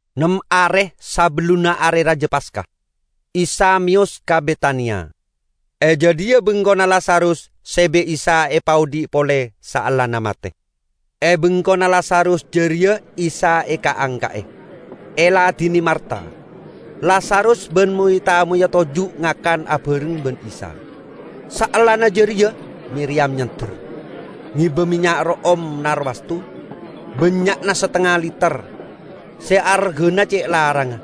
Nem are sabellunna Are Raja Paska, Isa meyos ka Betania. E jadhiya bengkona Lazarus se bi' Isa epaodhi' pole saellana mate. E bengkona Lazarus jareya Isa eka'-angka'e, eladine Marta. Lazarus ban moy-tamoyya toju' ngakan abareng ban Isa. Saellana jareya Miriyam nyander, ngeba mennya' ro'om narwastu, bannya'na satengnga liter, se argana ce' larangnga.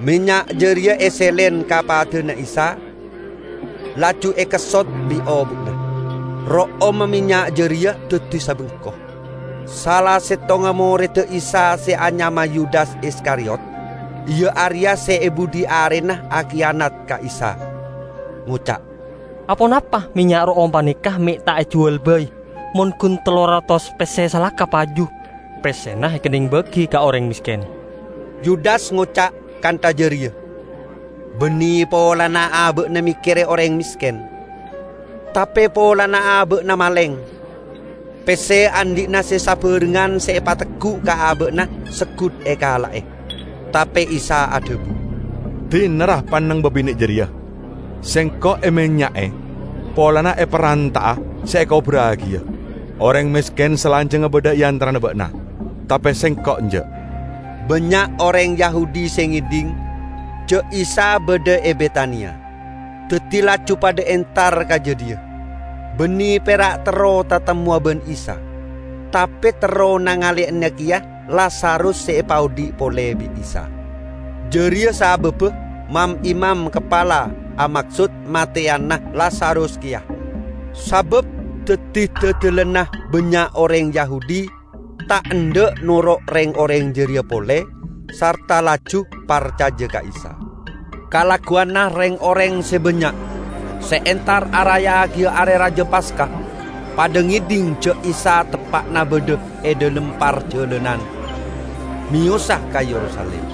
Mennya' jareya eselen ka padana Isa, laju ekessot bi' obu'na. Ro'omma mennya' jareya daddi sabengko. Sala settongnga moredda Isa se anyama Yudas Iskariyot -- iya areya se e budhi arena akiyanat ka Isa -- ngoca', "Aponapa mennya' ro'om paneka me' ta' ejuwal bai, mon gun tello ratos pesse salaka paju; pessena ekenneng bagi ka oreng mesken." Yudas ngoca' kantha jareya banne polana aba'na mekkere oreng mesken, tape polana aba'na maleng; pesse andhi'na se sabarengngan se epateggu' ka aba'na seggut ekala'e. Tape Isa adhabu, "Dina, ra, panneng babine' jareya! Sengko' emennya'e polana eparanta'a se ekoburragiya. Oreng mesken salanjangnga badha e antarana ba'na, tape Sengko' enja'." Bannya' oreng Yahudi se ngedhing ja' Isa badha e Betania, daddi laju padha entar ka jadhiya. Banne pera' terro tatemmowa ban Isa, tape terro nangaleyana keya Lazarus se epaodhi' pole bi' Isa. Jareya sababba mam-imam kapala amaksod mateyana Lazarus keya; sabab daddi dadalanna bannya' oreng Yahudi ta' endha' noro' reng-oreng jareya pole sarta laju parcaja ka Isa. Kalagguwanna reng-oreng se bannya' se entar araya'agiya Are Raja Paska padha ngedhing ja' Isa teppa'na badha e dhalem parjalanan meyosa ka Yerusalim.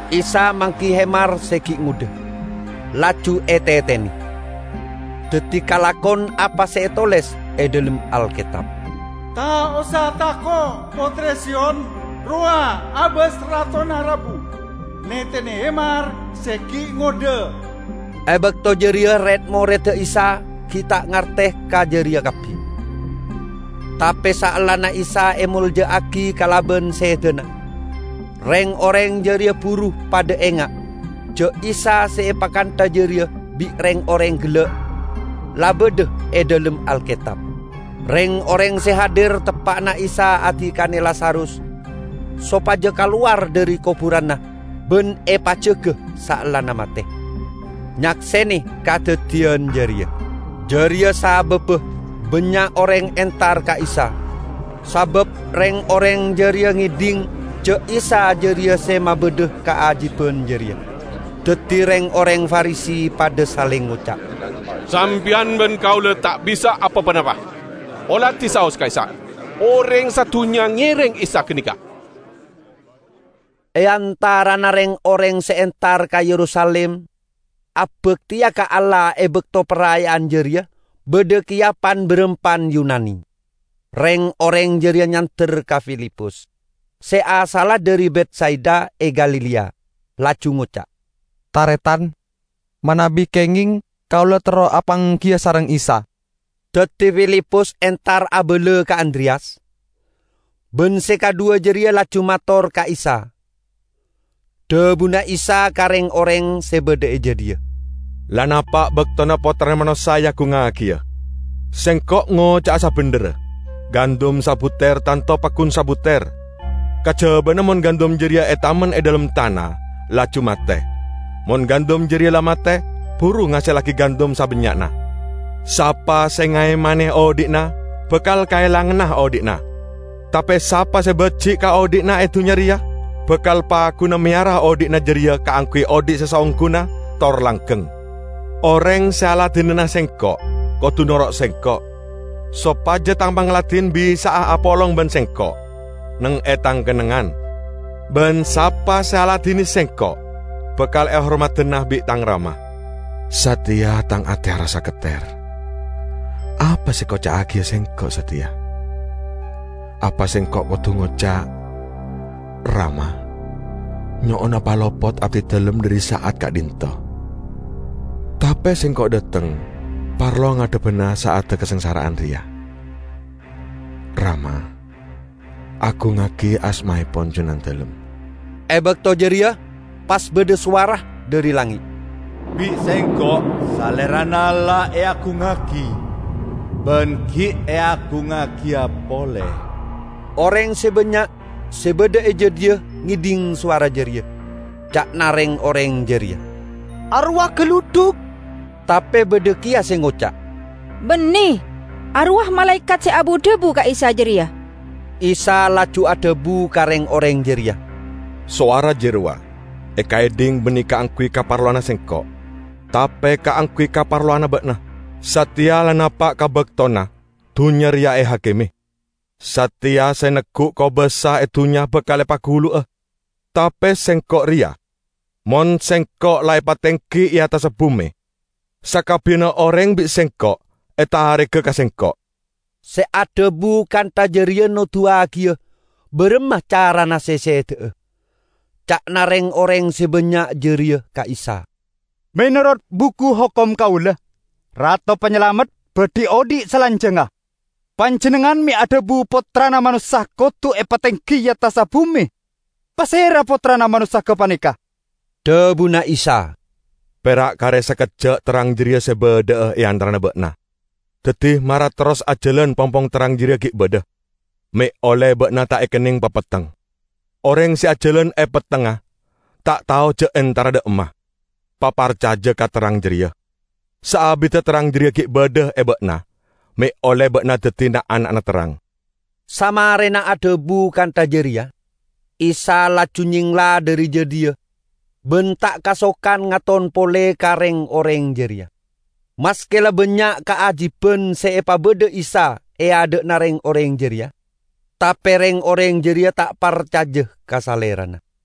Isa manggi hemar se gi' ngodha, laju etetene. Daddi kalakon apa se etoles e dhalem Alketab: "Ta' osa tako', pottre Siyon! Rowa' abas Ratona rabu, netene hemar se gi' ngodha!" E bakto jareya red-moredda Isa gi' ta' ngarte ka jareya kabbi. Tape saellana Isa emolja'agi kalaban sedana, reng-oreng jareya buru padha enga' ja' Isa se epakantha jareya bi' reng-oreng gella' la badha e dhalem Alketab. Reng-oreng se hadir teppa'na Isa adikane Lazarus sopaja kalowar dhari koburanna ban epajaga saellana mate, nyaksene kadaddiyan jareya. Jareya sababba bannya' oreng entar ka Isa, sabab reng-oreng jareya ngedhing ja' Isa jareya se mabadha kaajiban jareya. Daddi reng-oreng Farisi padha saleng ngoca', "Sampeyan ban kaula ta' bisa apa-ponapa. Oladi saos, ka'issa', oreng sadunnya ngereng Isa ganeka!" E antarana reng-oreng se entar ka Yerusalim abakteya ka Allah e bakto paraya'an jareya badha keya pan-barampan Yunani. Reng-oreng jareya nyander ka Filipus, se asalla dhari Betsaida e Galilea, laju ngoca', "Taretan, manabi kengeng, kaula terro apanggiya sareng Isa." Daddi Filipus entar abala ka Andreyas, ban se kadhuwa jareya laju mator ka Isa. Dhabuna Isa ka reng-oreng se badha e jadhiya, "La napa' baktona Pottrana Manossa eagungngagiya. Sengko' ngoca'a sabendherra: Gandum sabuter tanto paggun sabuter, kajabana mon gandum jareya etamen e dhalem tana laju mate. Mon gandum jareya la mate, buru ngasellagi gandum sabannya'na. Sapa se ngaemane odhi'na bakal kaelangana odhi'na. Tape sapa se baji' ka odhi'na e dunnya reya bakal pagguna meyara odhi'na jareya kaangguy odhi' se saongguna tor langgeng. Oreng se aladinana Sengko' kodu noro' Sengko', sopaja Tang pangladin bisa'a apolong ban Sengko' neng e Tang kennengngan. Ban sapa se aladine Sengko' bakal ehormadana bi' Tang Rama." "Sateya Tang ate arassa ketter; apa se ekoca'agiya Sengko' sateya? Apa Sengko' kodu ngoca', 'Rama, nyo'ona palopot abdidalem dhari sa'at ka'dhinto'?' Tape Sengko' dhateng parlo ngadhebbana sa'adda kasangsara'an reya. Rama, agungngagi asmaepon Junandalem!" E bakto jareya pas badha sowara dhari langnge', "Bi' Sengko' Salerana la eagungngagi, ban gi' eagungngagiya pole." Oreng se bannya' se badha e jadhiya ngedhing sowara jareya. Ca'na reng-oreng jareya, "Arowa galudhuk!" Tape badha keya se ngoca', "Banne, arowa malaekat se abu-dhabu ka Isa jareya!" Isa laju adhabu ka reng-oreng jareya, "Sowara jarowa ekaedhing banne kaangguy kaparlowanna Sengko', tape kaangguy kaparlowanna ba'na. Sateya la napa' ka baktona dunnya reya ehakime, sateya se neggu' kobasa e dunnya bakal epagulu'a. Tape Sengko' reya, mon Sengko' la epatenggi e attassa bume, sakabbiyanna oreng bi' Sengko' etarega ka Sengko'." Se adhabu kantha jareya noduwagiya baramma carana se seda'a. Ca'na reng-oreng se bannya' jareya ka Isa, "Menorot Buku Hokom kaula, Rato Panyalamet badhi odhi' salanjangnga. Panjennengngan me' adhabu Pottrana Manossa kodu epatenggi e attassa bume? Pasera Pottrana Manossa gapaneka?" Dhabuna Isa, "Pera' kare sakejja' terrang jareya se badha'a e antarana ba'na. Daddi, mara terros ajalan pongpong terrang jareya gi' badha, me' olle ba'na ta' ekenneng papetteng. Oreng se ajalan e pettengnga ta' tao ja' entara dha' emma. Paparcaja ka terrang jareya, saabidda terrang jareya gi' badha e ba'na, me' olle ba'na daddi na'-ana'na terrang." Samarena adhabu kantha jareya, Isa laju nyengla dhari jadhiya ban ta' kasokan ngaton pole ka reng-oreng jareya. Maske la bannya' kaajiban se epabadha Isa e adha'na reng-oreng jareya, tape reng-oreng jareya ta' parcaja ka Salerana.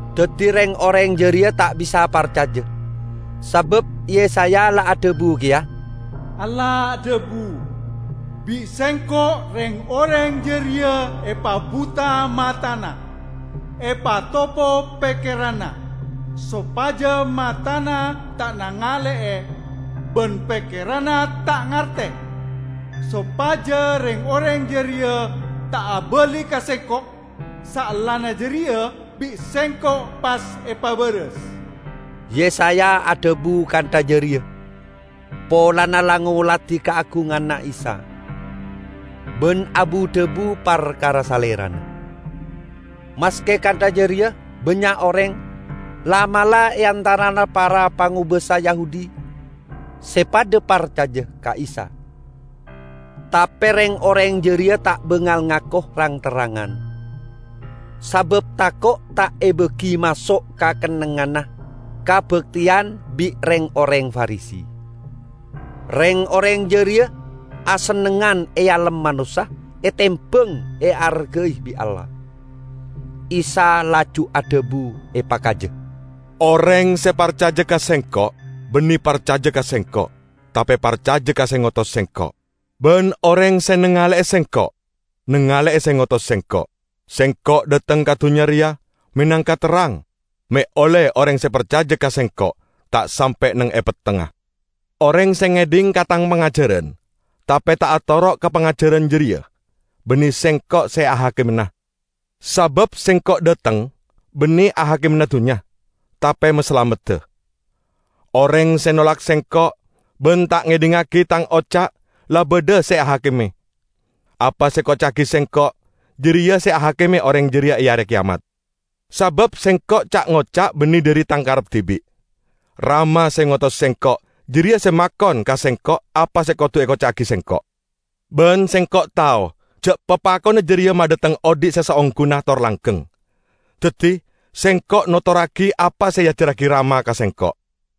Daddi reng-oreng jareya ta' bisa parcaja, sabab Yesaya la adhabu keya, "Allah adhabu, 'Bi' Sengko' reng-oreng jareya epabuta matana, epatopo pekkeranna; sopaja matana ta' nangale'e, ban pekkeranna ta' ngarte. Sopaja reng-oreng jareya ta' abali ka Sengko', saellana jareya bi' Sengko' pas epabaras.' " Yesaya adhabu kantha jareya polana la ngoladi kaagunganna Isa, ban abu-dhabu parkara Salerana. Maske kantha jareya, bannya' oreng, la'-mala' e antarana para pangobasa Yahudi, se padha parcaja ka Isa. Tape reng-oreng jareya ta' bangal ngako rang-terrangan, sabab tako' ta' ebagi maso' ka kennengnganna kabakteyan bi' reng-oreng Farisi. Reng-oreng jareya asennengngan ealem manossa etembang eargai bi' Allah. Isa laju adhabu epakaja, "Oreng se parcaja ka Sengko' banne parcaja ka Sengko', tape parcaja ka se ngotos Sengko'. Ban oreng se nangale'e Sengko', nangale'e se ngotos Sengko'. Sengko' dhateng ka dunnya reya menangka terrang me' olle oreng se parcaja ka Sengko' ta' sampe' neng e pettengnga. Oreng se ngedhing ka Tang pangajaran tape ta' atoro' ka pangajaran jareya, banne Sengko' se ahakimana. Sabab Sengko' dhateng banne ahakimana dunnya, tape masalamedda. Oreng se nolak Sengko' ban ta' ngedhingngagi Tang oca' la badha se ahakime. Apa se ekoca'agi Sengko', jareya se ahakime oreng jareya e Are Keyamat. Sabab Sengko' ca'-ngoca' banne dhari Tang karep dibi'; Rama se ngotos Sengko', jareya se makon ka Sengko' apa se kodu ekoca'agi Sengko'. Ban Sengko' tao ja' papakonna jareya madhateng odhi' se saongguna tor langgeng. Daddi Sengko' notorragi apa se eajarragi Rama ka Sengko'."